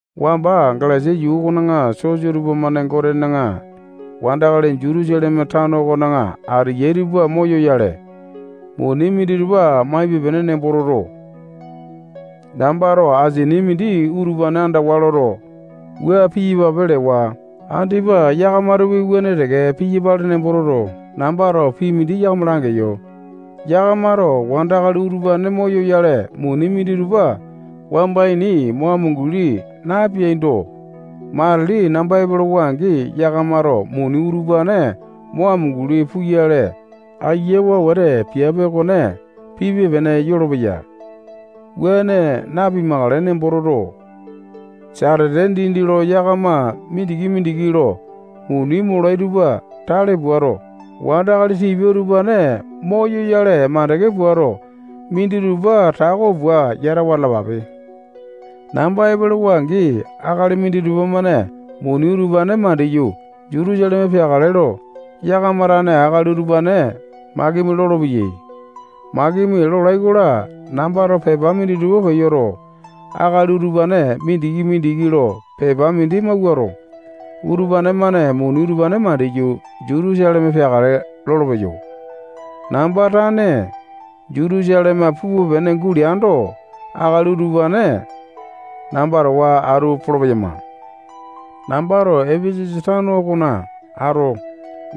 Wamba Galesia yuu okona sosa tupamane Gotena wandakali Jutusaleme tano okona ateyai tupa moyoyale, muni minditupa maipe-pene nembo toto, nambato asini mindi utupane andawa loto, wua piyapape lewa. Andipa yakamatopi wuane teke piyapale nembo toto, nambato pii mindi yakama langeyo. Yakamato wandakali utupane moyoyale, muni minditupa wamba ini mo amunguli napeaindo, matili namba epolowa-angi, yakamato muni utupane mo amunguli puyale, ayiawa wete piape okone pipe-pene yolopeya. Wuane napimakale nembo toto, satete dindi lo yakama mindiki-mindiki lo muni molai tupa tale puato, wandakali tipia utupane moyoyale makande puato, minditupa tako pua yatawa atalapape. Namba epolowa-angi, akali minditupa-mane muni utupane mandiyu, Jutusaleme peakale lo, yakama tane akali utupane makimi lolopeyai. Makimi lolai-kola, nambato pepa minditupa peyoto, akali utupane mindiki-mindiki lo pepa mindi mawuato, utupane-mane muni utupane mandiyu, Jutusaleme peakale lolopeyo. Namba tane Jutusaleme pupe-pene guleando, akali utupane namba towa atu polo-peyama. Nambato Epesasa tano okona ato,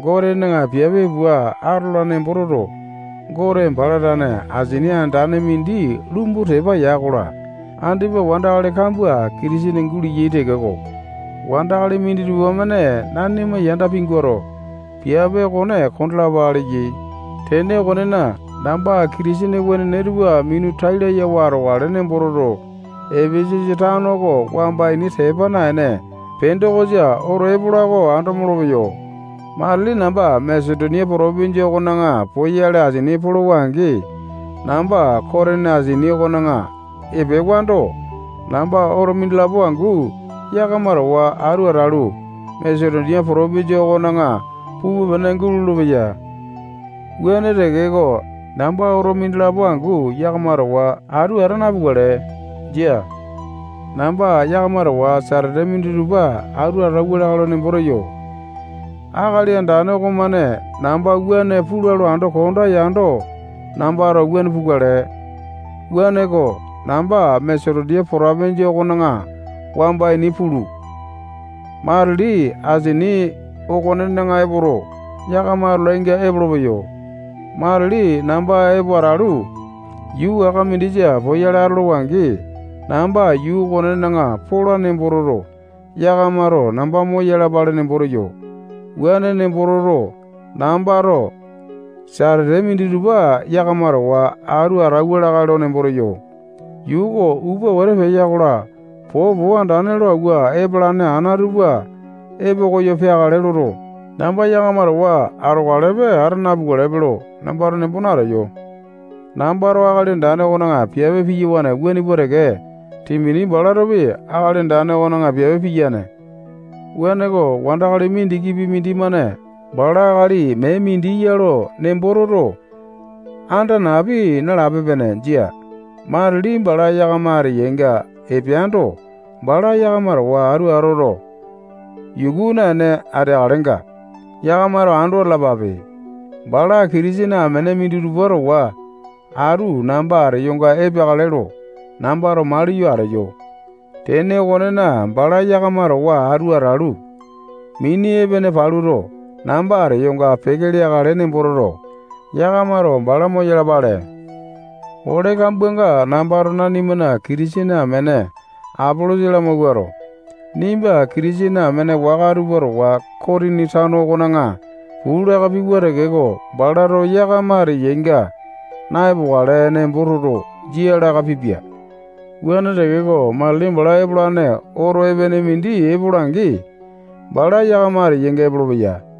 Gotena piape pua atola nembo toto, Gote bala tane asini andane mindi lumbu tepa ya-kola, andipa wandakali kambua Kitisene guleyai tekeko, wandakali minditupa-mane nanima yanda pinguato, piape okone kondalapa leyai. Tene okonena, namba Kitisene wenene tupa minu tai layawa atokale nembo toto, Epesasa tano oko wamba ini tepa naene, Pendokosa oto epola oko ando molopeyo. Matili namba Masetonia potopinjia okona poyale asini polowa-angi, namba Kotini asini okona epewando, namba oto mindilapo angu yakama towa atu atalu, Masetonia potopinjia okona pupe-pene gulolo-peya. Wuane tekeko, namba oto mindilapo angu yakama towa atu ata napukale. Jia. Namba yakama towa atu satete minditupa atauwa lakae lo nembo teyo. Akali Andane okomane namba wuane pula lo ando konda yando, nambato wuane pukale. Wuaneko, namba Masetonia potopinjia okona wamba ini pulu, matili asini okonena epoto, yakama atolainga epolopeyo. Matili namba epo atalu, yuu waka mindisa poyale atolowa-angi, namba yuu okonena pola nembo toto, yakamato namba moyalapale nembo teyo. Wuane nembo toto, nambato satete minditupa yakama towa atu atauwa lakae lo nembo teyo. Yuu oko upa wete peya-kola, popo andane lo awua epalane ana tupa epo koyo peakale loto, namba yakama towa atokalepe, ata napukalepe lo nambato nembo nateyo. Nambato Akali Andane okona piape piyawane wuane pua teke, Timoti balatopi Akali Andane okona piape piyane. Wuaneko, wandakali mindikipi mindimane bala akali mee mindi ya lo nembo toto, anda napi nalape-pene. Jia. Matili bala yakama ateyainga epeando, bala yakama towa atu atoto, yuku naene ateakalenga, yakamato ando atalapape. Bala Kitisene amene minditupa towa atu namba ateyonga epeakale lo nambato maliyo ateyo. Tene okonena, bala yakama towa atu atalu, mini epene paluto, namba ateyonga peke leakale nembo toto, yakamato bala moyalapale. Ole kambuanga nambato nanimana Kitisene amene Apolosa lamawuato, nimba Kitisene amene waka tupa towa Kotini tano okona puu laka piwa tekeko, balato yakama ateyainga na-epokale nembo toto, jia laka pipia. Wuane tekeko, matili bala epolane oto epene mindi epola-angi, bala yakama ateyainga epolopeya.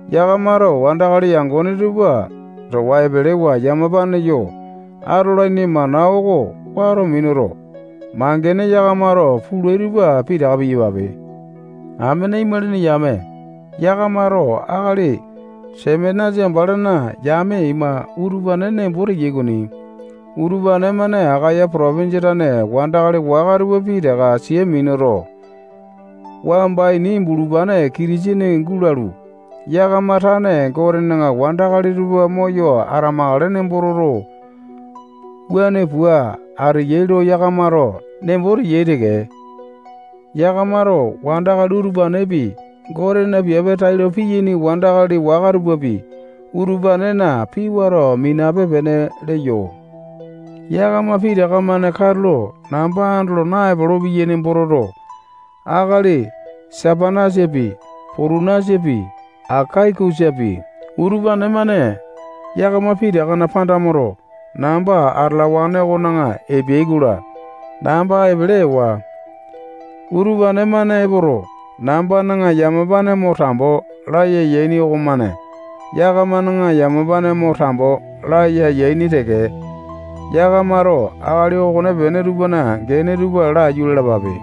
Yakamato wandakali yangone tupa towa epelewa yamapane yo atolaini mana oko wato minuto, mangene yakamato pulai tupa pitaka piyapape. Amene imalini yame, yakamato akali Sepanasa balana yame ima, utupane nembo teyai okoni. Utupane-mane Akaya potopinjia tane wandakali waka tupa pitaka sia minuto, wamba ini bulupane Kitisene gulalu, yakama tane Gotena wandakali tupa moyo atamakale nembo toto, wuane pua ateyai lo yakamato nembo teyai teke. Yakamato wandakali utupanepi, Gotena piape tailo piyaini wandakali waka tupapi, utupanena pii wato minape-pene leyo. Yakama pitaka-mane katulo namba andolo naepolo-peyai nembo toto, akali Sepanasapi, Potunasapi, Akaikusapi, utupane-mane yakama pitakana panda moto, namba atalawane okona epeai-kola, namba epele ewa. Utupane-mane epoto, nambana yamapane mo tambo laya yaini okomane yakamana yamapane mo tambo laya yaini teke. Yakamato akali okonepene tupana gene tupa laiyu lalapape.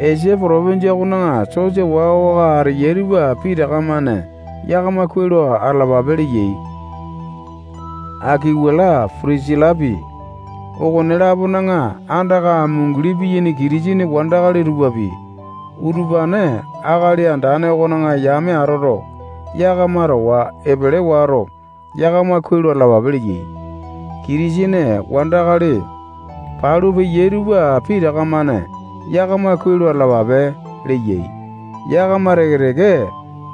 Esia potopinjia okona sosa waka-waka ateyai tupa pitaka-mane yakama kuai lo atalapape leyai. Akuwilapi, Pitisilapi, okone-lapona andaka amunguli piyaini Kitisene wandakali tupapi, utupane Akali Andane okona yame atoto, yakama towa epele wato, yakama kuai lo atalapape leyai. Kitisene wandakali palu peyai tupa pitaka-mane yakama kuai lo atalapape leyai. Yakama teke-teke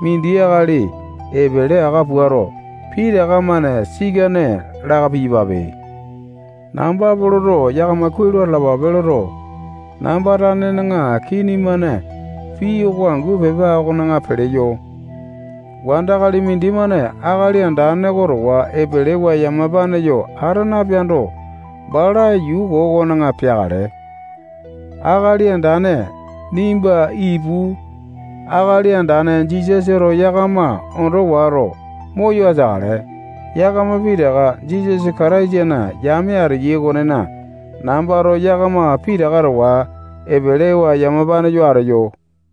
mindi akali epele aka puato, pitaka-mane sikane laka piyapape. Namba Poloto yakama kuai lo atalapape loto, namba tanena kini-mane pii oko angu pepa okona peleyo. Wandakali mindimane Akali Andane oko towa epelewa yamapane yo ata napeando, bala yuu koo okona peakale. Akali Andane, nimba ipu. Akali Andane Jisasato yakama ondo wato, moyo ateakale. Yakama pitaka Jisasa Kataisana yame ateyai okonena, nambato yakama pitaka towa epelewa yamapane yo ateyo.